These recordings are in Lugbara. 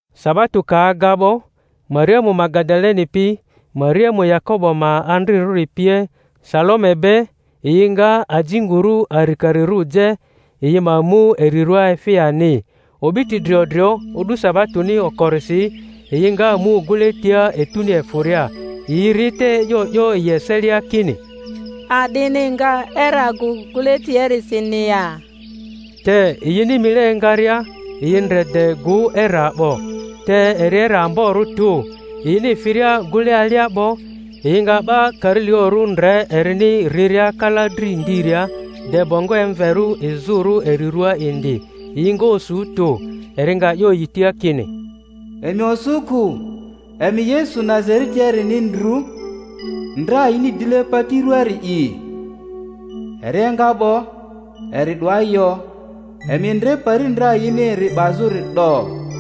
Sabato ka aga 'bo, Mariamu Magadaleni pi, Mariamu Yakobo ma andrirᴜri pie, Salome be, yi nga ajinguru arikarirᴜ je, yi ma mu eri rᴜa efi ani. O'biti drio drio, o'du sabatoni okorisi, yi nga mu gᴜle tia etuni efᴜria. Yi ri te e'yo 'yo yi eselia kini, A'dini nga era gᴜ gᴜle tiliarisini ya? Te yini mile engaria, yi ndre de gᴜ era 'bo; te eri era amborᴜ tᴜ. Yini firia gᴜle alia 'bo, yi nga 'ba karilaᴜrᴜ ndre erini riria kala dri ndiria, de bongo emverᴜ izᴜrᴜ eri ruaa indi; yi nga osu tᴜ. Eri nga 'yo yi tia kini, Emi osu kᴜ; emi Yesu Nazaretiarini ndru, ndra yini dile pati ruaari'i. Eri enga 'bo, eri 'doa yo; emi ndre pari ndra yini eri 'bazᴜri 'do.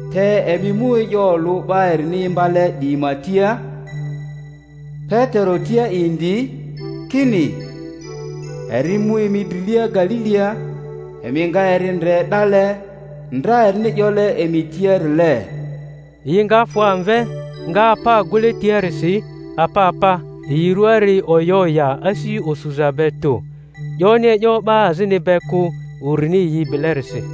Te emi mu e'yo olᴜ 'ba erini imbale 'diyi ma tia, Petero tia indi, kini, eri mu emi drilia Galilia; emi nga eri ndre 'dale, ndra erini 'yole emi tiarile. Yi nga fᴜ amve, nga apa gᴜle tiarisi apa apa; yi rᴜari oya oya asi osuza be tᴜ; 'yoni e'yo 'ba azini be kᴜ, urini yi bilerisi.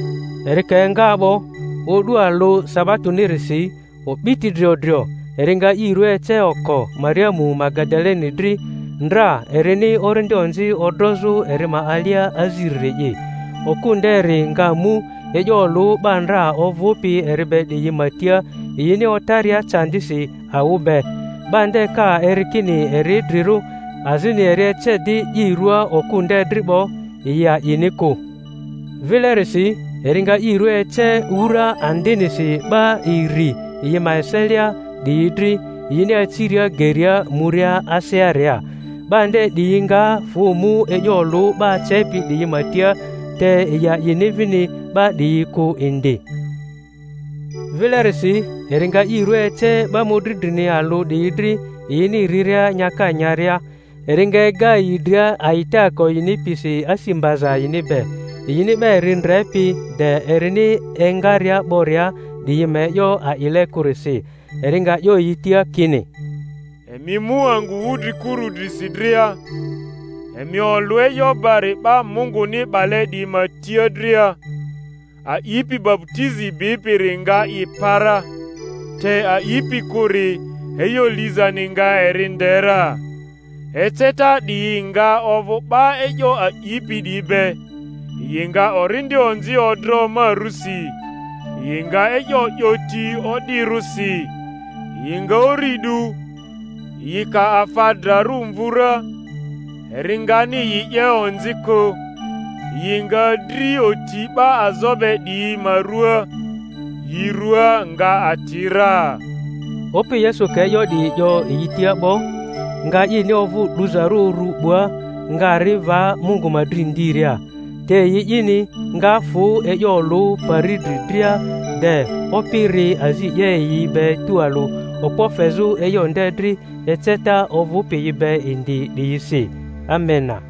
Eri ka enga 'bo, o'du alᴜ sabatonirisi o'biti drio drio, eri nga i rua ece oko Mariamu Magadaleni dri, ndra erini orindi onzi odrozᴜ eri ma alia aziriri’i. Okᴜ nderi nga mu e'yo olᴜ 'ba ndra ovᴜpi eri be 'diyi ma tia, yini otaria candisi awᴜ be. 'Ba nde ka eri kini eri idrirᴜ, azini eri ece di i rua okᴜ nde dri 'bo, yi a'ini kᴜ. Vilerisi eri nga i rua ece wura andmisi 'ba iri yi ma eselia 'diyi dri, yini aciria geria, muria asearia. 'Ba nde 'diyi nga fᴜ mu e'yo olᴜ 'ba acepi 'diyi ma tia, te yi a'ini vini 'ba 'diyi kᴜ indi. Vilerisi eri nga i rᴜa ece 'ba mᴜdri drini alᴜ 'diyi dri yini riria nyaka nyaria; eri nga ega yi dria a'itaako yini pisi asi mbaza yini be, yini 'ba eri ndrepi de erini engaria 'boria 'diyi ma e'yo a'ile kᴜrisi. Eri nga 'yo yi tia kini, Emi mu angᴜ wudrikuru drisi dria, emi olᴜ e'yo bari 'ba Munguni 'bale 'diyi ma tia dria. A'ipi baputizi bipiri nga i pa ra; te a'ipi kᴜri, e'yo lizani nga eri nde ra. Eceta 'diyi nga ovᴜ 'ba e'yo a'ipi 'diyi be: yi nga orindi onzi odro ma rᴜsi; yi nga e'yo 'yo ti o'dirᴜsi; yi nga uri 'du; yi ka afa drarᴜ mvu ra, eri ngani yi 'ye onzi kᴜ; yi nga dri oti 'ba azo be 'diyi ma ruaa, yi rᴜa nga ati ra. Opi Yesu ka e'yo 'diyi 'yo yi tia 'bo, nga ini ovᴜ 'duzarᴜ uru 'bua, nga ri va Mungu ma dri ndiria. Te yi'ini, nga fᴜ e'yo olᴜ pari dri dria, de Opi ri azi 'ye yi be tualᴜ, okpo fezᴜ e'yo nde dri eceta ovᴜpi yi be indi 'diyisi. Amena.